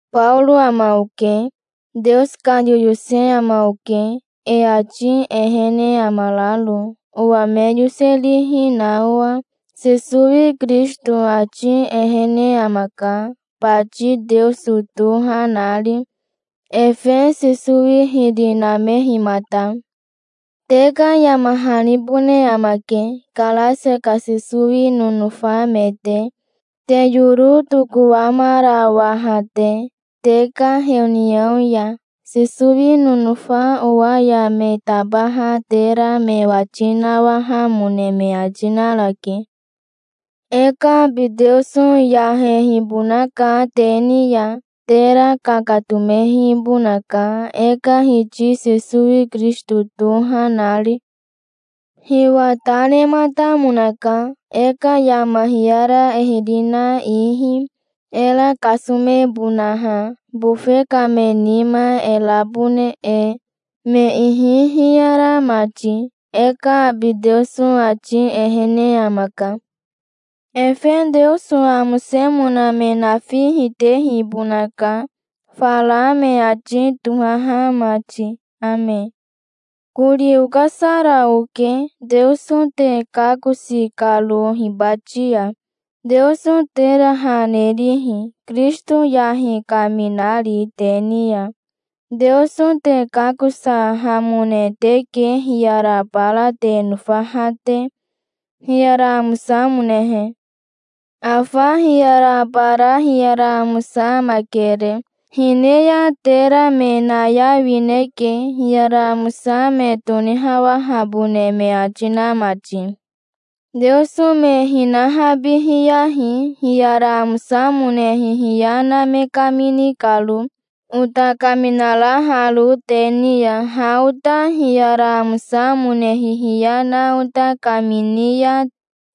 Baoro ama oke. Teoso ka yoyose ama oke, e ati ehene amararo, owa me yoserihi na owa. Sesowi Kirisito ati ehene amaka, bati Teoso toha nari, efe Sesowi hiri namehimata. Te ka yama hanibone amake, Karasia ka Sesowi nonofa me te, te yoro tokowamarawaha te, te ka heoniao ya. Sesowi nonofa owa ya me tabaha tera me wati nawahamone me ati narake. E ka abi Teoso yahehibonaka te ni ya. Tera kakatomehibonaka, e ka Hiti Sesowi Kirisito toha nari. Hiwa ta nematamonaka, e ka yama hiyara e hiri na ihi, era kasomebonaha, bofe ka me nima e rabone e, me ihi hiyara mati. E ka abi Teoso ati ehene amaka. Efe Teoso amosemona me nafi hitehibonaka, fara me ati tohaha mati. Ame. Kori okasara oke, Teoso te kakosi karo hibati ya, Teoso tera ha nerihi, Kirisito yahi kaminari te ni ya. Teoso te kakosahamone teke hiyara bara te nofaha te, hiyara amosamonehe. Afa hiyara bara hiyara amosa amakere. Hine ya tera me nayawineke, hiyara amosa me tonihawahabone me ati na mati. Teoso me hinahabihiyahi, hiyara amosamone hihiya na me kamini karo, ota kaminaraharo te ni ya. Ha ota hiyara amosamone hihiya na ota kamini ya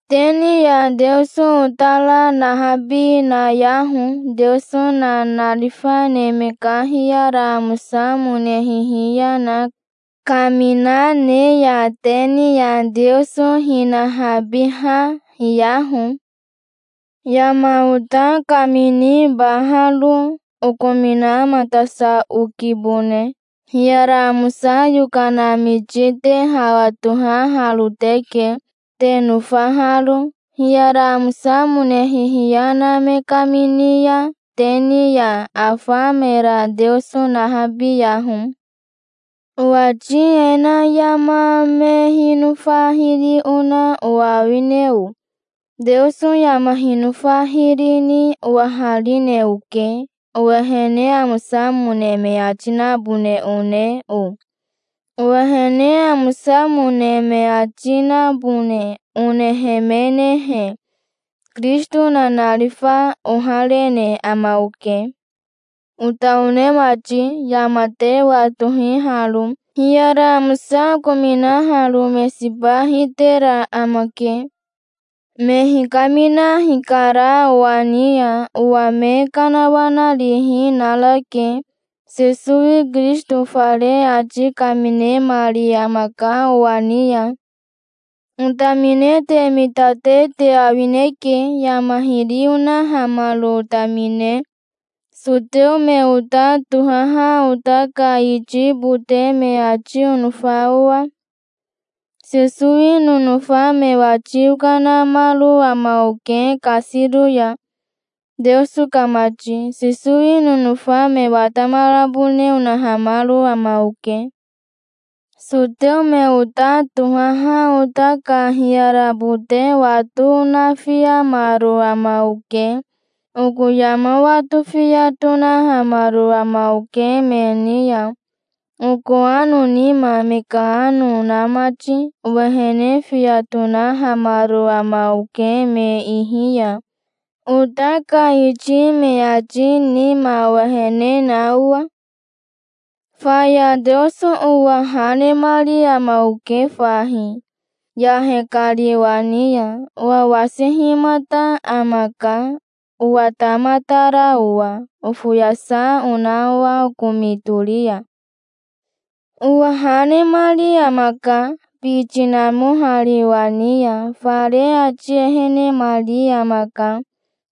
te ni ya Teoso otara nahabi nayaho. Teoso nanarifa neme ka hiyara amosamone hihiya na kamina ne ya te ni ya Teoso hinahabiha hiyaho. Yama ota kaminibaharo okominamatasa okibone. Hiyara amosa yokana miti te hawa tohaharo teke, te nofaharo. Hiyara amosamone hihiya na me kamini ya te ni ya, afa mera Teoso nahabiyaho. Owati e na yama me hinofa hiri ona owa awine o? Teoso yama hinofa hiri ni owaharine oke. Owehene amosamone me ati nabone one o? Owehene amosamone me ati nabone onehemenehe, Kirisito nanarifa oharene ama oke. Ota one mati, yama te watohi haro. Hiyara amosa okominaharo me siba hitera amake. Me hikamina hikara owa ni ya. Owa me kanawanarihi narake. Sesowi Kirisito fare ati kaminemari amaka owa ni ya. Otamine te mitate te awineke, yama hiri onahamaro otamine, soteo me ota tohaha ota ka iti bote me ati onofa owa. Sesowi nonofa me wati okanamaro ama oke kasiro ya, Teoso ka mati. Sesowi nonofa me watamarabone onahamaro ama oke. Soteo me ota tohaha ota ka hiyara bote wato onafiamaro ama oke. Oko yama wato fiya tonahamaro ama oke me ni ya, oko ano nima me ka ano na mati. Owehene fiya tonahamaro ama oke me ihi ya, ota ka iti me ati nima owehene na owa. Faya Teoso owa ha nemari ama oke fahi, yahe kari owa ni ya. Owa wasihimata amaka, owatamatara owa, ofoyasa ona owa okomi tori ya. Owa ha nemari amaka, biti namohari owa ni ya. Fare ati ehenemari amaka,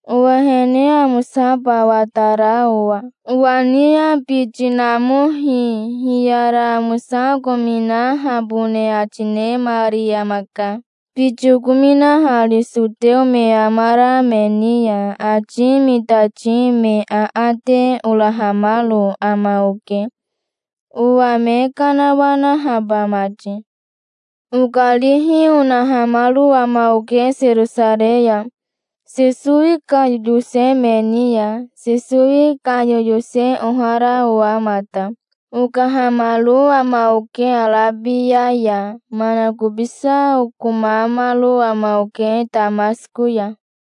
owehene amosaba watara owa. Owa ni ya biti namohi hiyara amosa okominahabone ati nemari amaka, biti okominahari soteo me amara me ni ya. Ati mitati me aate orahamaro ama oke, owa me kanawanahaba mati. Okarihi onahamaro ama oke Serosarei ya, Sesowi ka yoyose me ni ya, Sesowi ka yoyose ohara owa mata. Okahamaro ama oke Arabia ya. Manakobisa okomamaro ama oke Tamasiko ya.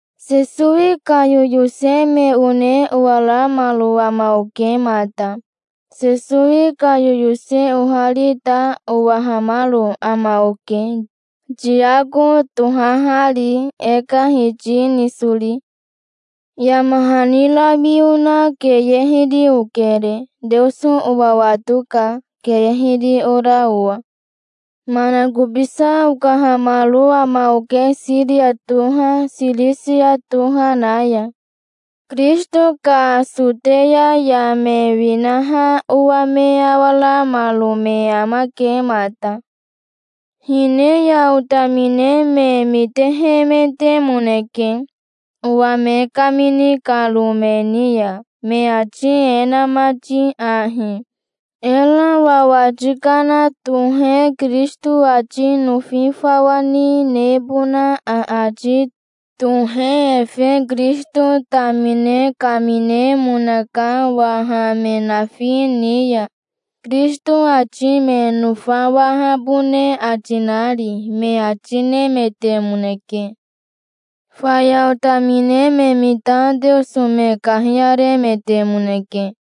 Sesowi ka yoyose me one owaramaro ama oke mata. Sesowi ka yoyose ohari ta owahamaro ama oke, Tiako tohahari, e ka Hiti nisori. Yama hani rawi ona keye hiri okere. Teoso owa watoka, keye hiri ora owa. Manakobisa okahamaro ama oke, Siria toha, Sirisia toha na ya. Kirisito ka Soteya ya me winaha owa me awaramaro me amake mata. Hine ya otamine me mitehemetemoneke, owa me kamini karo me ni ya, me ati e na mati ahi: "Era wawati kana tohe Kirisito ati nofi fawa ni nebona aati tohe efe Kirisito tamine kaminemonaka waha me nafi ni ya, Kirisito ati me nofawahabone ati nari", me ati nemetemoneke. Faya otamine me mita Teoso me kahiyaremetemoneke.